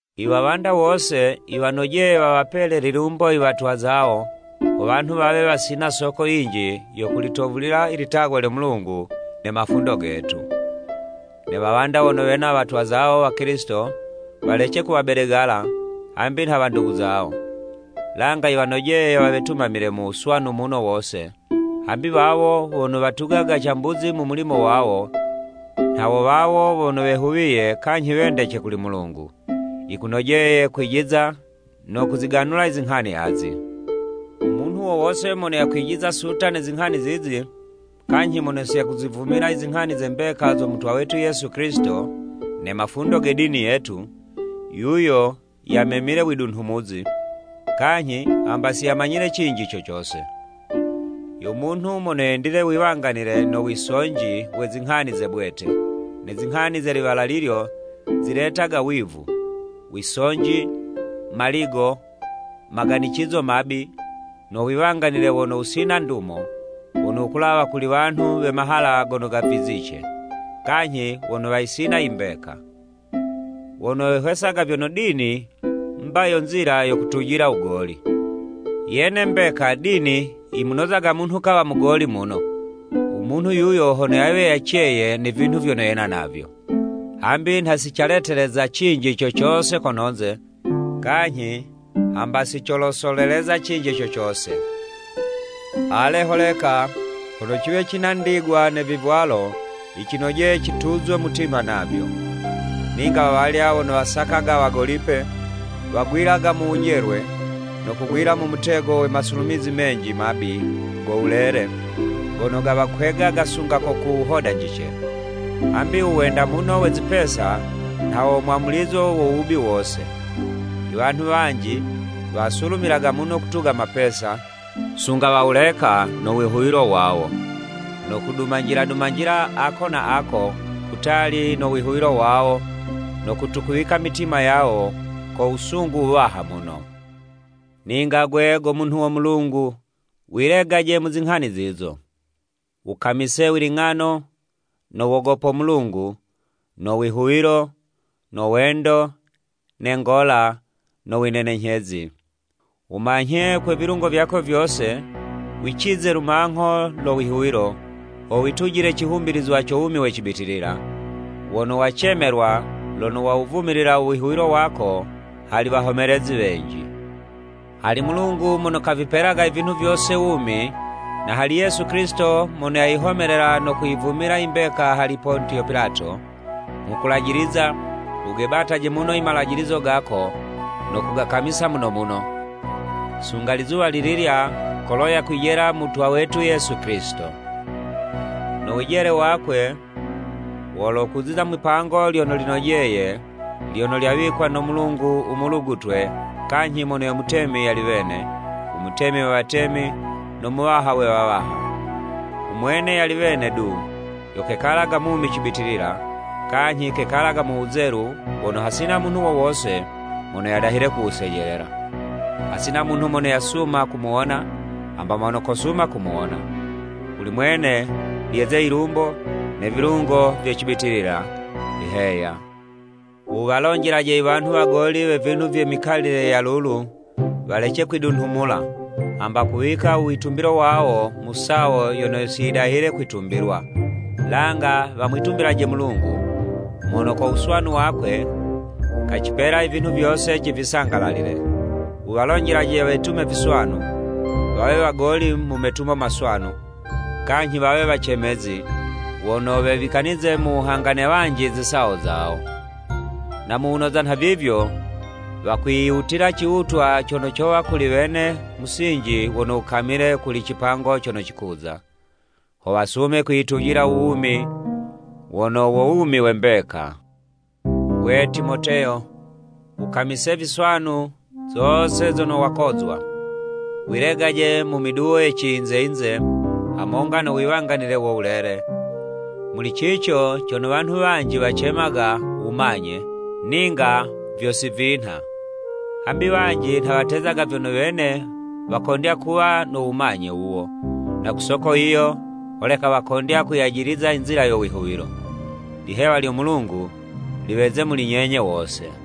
Iwawanda wose yiwanojeye wawapele lilumbo iwatwa zawo ho wanhu wawe wasina soko yinji yo kulitovulila i litagwa lyo Mulungu ne mafundo getu. Ne wawanda wono wena watwa zawo Wakilisito, walece kuwabedegala, hambi nha wandugu zawo. Langa yiwanojeye wawetumamile mu wuswanu muno wose, hambi wawo wono watugaga cambuzi mu mulimo wawo, nha wo wawo wono wehuwiye kanyhi wendece kuli Mulungu. Yikunojeye kwijiza no kuziganula izinghani azi: U munhu wo wose mono yakwijiza suta ne zinghani zizi, kanyhi mono si yakuzivumila i zinghani ze mbeka zo Mutwa wetu Yesu Kilisito ne mafundo ge dini yetu, yuyo yamemile widunhumuzi, kanyhi hamba siyamanyile cinji co cose. Yo munhu mono yendile wiwanganile no wisonji we zinghani ze bwete, ne zinghani ze liwala lilyo, ziletaga wivu, wisonji, maligo, maganicizo mabi, no wiwanganile wono wusina ndumo, wono wukulawa kuli wanhu we mahala gono gavizice, kanyhi wono wayisina imbeka. Wono wehwesaga vyono dini, mba yo nzila yo kutujila wugoli. Yene mbeka dini, yimunozaga munhu kawa mugoli muno, u munhu yuyo hono yawe yaceye ne vinhu vyono yena navyo. Hambi nha sicaleteleza cinji co cose kononze, kanyhi hamba sicolosoleleza cinji co cose. Ale holeka, hono ciwe cina ndigwa ne vivwalo, yicinojeye cituzwe mutima navyo. Ninga wawalya wono wasakaga wagolipe, wagwilaga mu wujelwe, no kugwila mu mutego we masulumizi menji mabi go wulele, gono gawakwegaga sunga ko ku wuhodanjice. Hambi u wenda muno we zipesa nha wo mwamulizo wo wubi wose. Iwanhu wanji wasulumilaga muno kutuga mapesa, sunga wawuleka no wihuwilo wawo, no kudumanjila dumanjila ako na ako, kutali no wihuwilo wawo no kutukuwika i mitima yawo ko wusungu wuwaha muno. Ninga 'gwe, go munhu wo Mulungu, wilegaje mu zinghani zizo. Wukamise wiling'ano, no wogopo Mulungu, no wihuwilo, no wendo, ne ngola, no winenenyhezi. Wumanyhe kwe vilungo vyako vyose wicize lumangho lo wihuwilo, ho witujile cihumbilizwa co wumi we cibitilila, wono wacemelwa lono wawuvumilila u wihuwilo wako hali wahomelezi wenji. Hali Mulungu mono kavipelaga i vinhu vyose wumi, na hali Yesu Kilisito mono yayihomelela no kuyivumila imbeka hali Pontiyo Pilato, nghukulajiliza, wugebataje muno i Malajilizo gako no kugakamisa muno muno, sunga lizuwa lililya kolo yakwijela Mutwa wetu Yesu Kilisito. No wijele wakwe, wolokuziza mwipango lyono linojeye lyono lyawikwa no Mulungu umulugutwe kanyhi mono yo Mutemi yali wene, u Mutemi we watemi no Muwaha we wawaha. Umwene yali wene du yo kekalaga mumi cibitilila, kanyhi kekalaga mu wuzelu wono hasina munhu wo wose mono yadahile kuwusejelela. Hasina munhu mono yasuma kumuwona, hamba mono kosuma kumuwona. Kuli mwene lyeze yilumbo ne vilungo vye cibitilila! Heya. Wuwalonjelaje iwanhu wagoli we vinhu vye mikalile ya lulu, walece kwidunhumula, hamba kuwika u witumbilo wawo mu sawo yono siyidahile kwitumbilwa, langa wamwitumbilaje Mulungu, mono ko wuswanu wakwe, kacipela i vinhu vyose civisangalalile. Wuwalonjelaje wetume viswanu, wawe wagoli mu metumo maswanu, kanyhi wawe wacemezi, wono wewikanize mu wuhanga ne wanji zisawo zawo. Na mu wunoza nhavivyo wakwiyiwutila ciwutwa cono cowa kuli wene musinji wono wukamile kuli cipango cono cikuza. Ho wasume kwiyitujila u wumi wono wo wumi we mbeka. Gwe, Timoteyo wukamise viswanu zose zono wakozwa. Wilegaje mu miduwo ye ciyinze-yinze, hamonga no wiwanganile wo wulele, muli cico cono wanhu wanji wacemaga: “Wumanye” ninga vyo si vinha. Hambi wanji nha watezaga vyono wene wakondya kuwa no “Wumanye” wuwo, na ku soko yiyo holeka wakondya kuyajiliza i nzila yo wihuwilo. Lihewa lyo Mulungu, liweze muli nyenye wose!